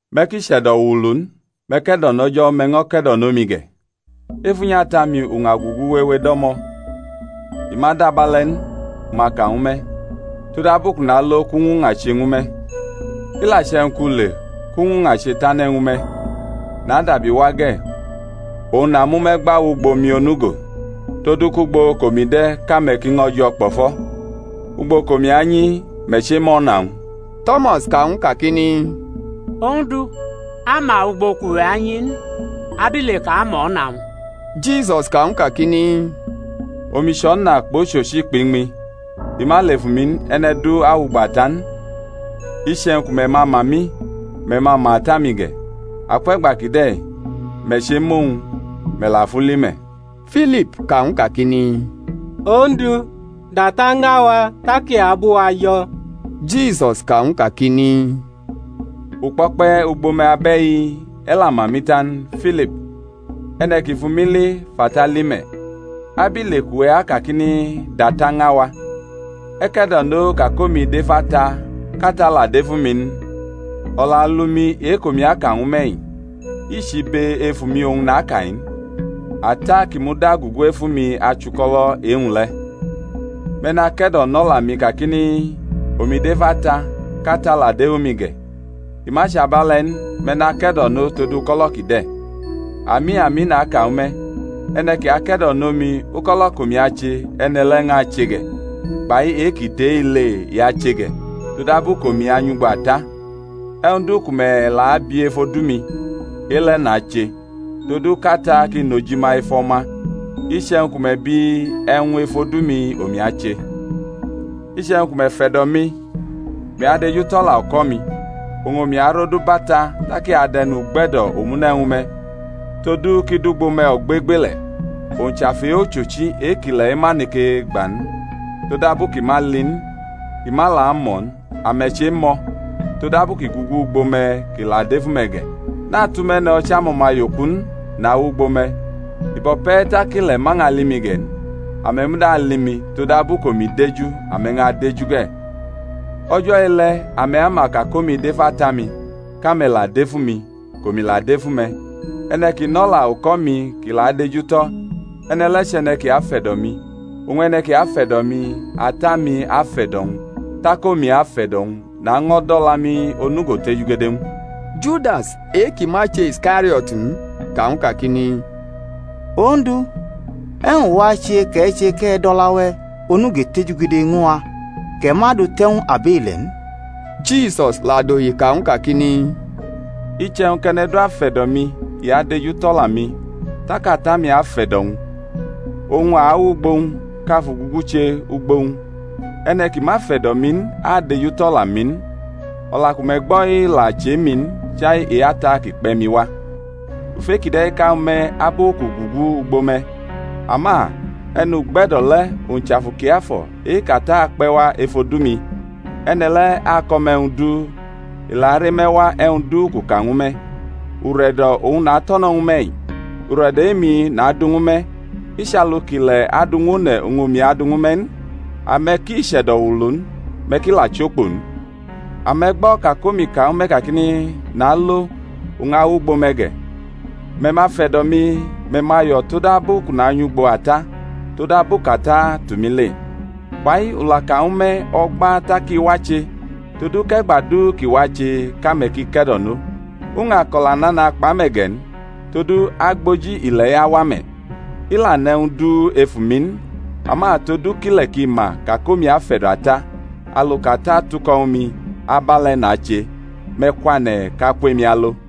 Me̩ ki chʼe̩do̩ wuulu n; me̩ ke̩do̩nʼO̩jo̩, me̩ ño̩ ke̩do̩nʼomi ge̩. Ef unyi Ata-mi uña ugugu wewe do̩mo̩; i ma dʼabe̩le̩ n u ma ka ñwu me̩; todabu kʼu nalo kʼu ñwʼuña che ñwu me̩. I la che̩wñ kʼu le kʼu ñwʼuña che tane̩ ñwu me̩, nadabi wa ge̩, oñ namʼume̩ gba wʼugbo mi onugo; todu kʼugbo kʼomi de̩ kʼame̩ ki ño̩ jo̩ kpo̩fo̩. Ugbo kʼomi anyi me̩ chema o̩na-wñ. To̩mas ka ñw u kakini, Ondu, a ma ugbo kʼuwe̩ anyi n; abile kʼa ma o̩na-wñ? Jisus ka ñw u kakini, Omi chʼo̩na kpʼochochi kpʼiñmi: i ma lʼef umi n, e̩ne̩ du awʼugbo Ata n. Iche̩wñ ku me̩ ma ma mi, me̩ ma ma Ata-mi ge̩. Akwe̩gba kide̩ me̩ chemʼowñ, me̩ la fʼu li me̩. Filip ka ñw u kakini, Ondu, dʼAta ña wa, tak i abʼuwa jo̩. Jisus ka ñw u kakini, U kpo̩kpe̩ ugbo me̩ abe̩-i, e̩ la ma mi ta n, Filip? E̩ne̩ ki fʼumi li fʼAta li me̩; abile kʼuwe̩ akakini, DʼAta ña wa? E̩ ke̩do̩no ka kʼomi dʼef Ata, kʼAta la dʼef umi n? O̩la alu-mi e-kʼomi aka ñwu me̩-i, i chʼibe efu-mi oñ naka-i n; Ata kʼi muda gugu efu mi achʼuko̩lo̩ e-wñ le̩. Me̩ nake̩do̩nʼo̩la mi kakini, Omi dʼef Ata, kʼAta la dʼef umi ge̩; i ma chʼabe̩le̩ n, me̩ nake̩do̩no tod uko̩lo̩ kide̩. Ami, ami, naka ñwu me̩, e̩ne̩ ki ake̩do̩nʼomi, uko̩lo̩ kʼomi ache, e̩ne̩ le̩ ñʼache ge̩, kpai e-ki tʼe-i le i ache ge̩; todabu kʼomi anyʼugbo Ata. E̩wñ du ku me̩ la abi ef odu-mi, e-le̩ nache, todu kʼAta ki nʼojima ef O̩ma. Iche̩wñ ku me̩ bi e̩wñ ef odu-mi, omi ache. Iche̩wñ ku me̩ fe̩do̩ mi, me̩ adejutʼo̩la uko̩-mi. Oñ omi arodubʼAta tak i adʼe̩nugbe̩do̩ omune̩ ñwu me̩, todu kʼi dʼugbo me̩ ogbegbele̩. Owñ chʼAfu e-ochochi e-kʼile̩-i ma neke gba n; todabu kʼi ma ali n, kʼi ma la amʼo̩ n; ame̩ chemʼo̩; todabu kʼi gugu ugbo me̩, kʼi la adʼef ume̩ ge̩. Natʼume̩ no̩ chʼamo̩maye-oku n; nawʼugbo me̩. I bo̩ pe̩ tak ile̩ ma ñʼali mi ge̩ n, ame̩ muda ali mi; todabu kʼomi deju, ame̩ ñʼadeju ge̩. O̩jo̩ e-le̩ ame̩ ama ka kʼomi dʼef Ata-mi, kʼame̩ la dʼef umi, kʼomi la dʼef ume̩. E̩ne̩ ki nʼo̩la uko̩-mi kʼi la adejutʼo̩, e̩ne̩ le̩ chʼe̩ne̩ ki afe̩do̩ mi; oñ e̩ne̩ ki afe̩do̩ mi, Ata-mi afe̩do̩-wñ, tak omi afe̩do̩-wñ, naño̩ dʼo̩la-mi onugo tejugede ñw u. Judas, e-kʼi ma chʼe-Iskario̩t in, ka ñw u kakini, Ondu, e̩wñ wache kʼe̩ che kʼe̩ dʼo̩la-we̩ onugo tejugede ñw a, kʼe̩ ma du te̩ ñw abile̩ n? Jisus la dohi ka ñw u kakini, Iche̩wñ kʼe̩ne̩ du afe̩do̩ mi i adejutʼo̩la-mi, tak Ata-mi afe̩do̩ wñ, oñ a awʼugbo-wñ, kʼa fʼugugu che ugbo-wñ. E̩ne̩ ki ma fe̩do̩ mi n adejutʼo̩la-mi n; o̩la ku me̩ gbo̩-i la chʼe-mi n, chai e-Ata ki kpe̩ mi wa. U fʼe-kide̩ ka ñwu me̩ abu kʼu gugu ugbo me̩. Ama E̩nugbe̩do̩ le̩, owñ chʼAfu Kiafo̩ e-kʼAta akpe̩ wa ef odu-mi, e̩ne̩ le̩ ako̩ me̩ e̩wñ du, i la are me̩ wa e̩wñ du kʼu ka ñwu me̩. Ure̩do̩ oñ nato̩no̩ ñwu me̩-i, ure̩do̩ e-mi nadu ñwu me̩; i chʼalu kʼile̩ adu ñw one̩ oñ omi adʼu ñwu me̩ n. Ame̩ ki chʼe̩do̩ wuulu n, me̩ ki la chokpo n. Ame̩ gbo̩ ka kʼomi ka ñwu me̩ kakini, Nalo, u ñʼawʼugbo me̩ ge̩. Me̩ ma fe̩do̩ mi, me̩ ma yo̩ todabu kʼu nanyʼugbo Ata, todabu kʼAta tʼumi le. Fa-i u la ka ñwu me̩ o̩gba tak i wache, todu kʼe̩gba du kʼi wache kʼame̩ ki ke̩do̩no. U ñʼako̩la nana kpʼame̩ ge̩ n, todu agboji ile̩-i awa me̩: i la nʼe̩wñ du ef umi n, ama todu kʼile̩ ki ma ka kʼomi afe̩do̩ Ata, alu kʼAta tuko̩ ñwu mi, abe̩le̩ nache. Me̩ kwane̩ kʼa kwʼemi alo.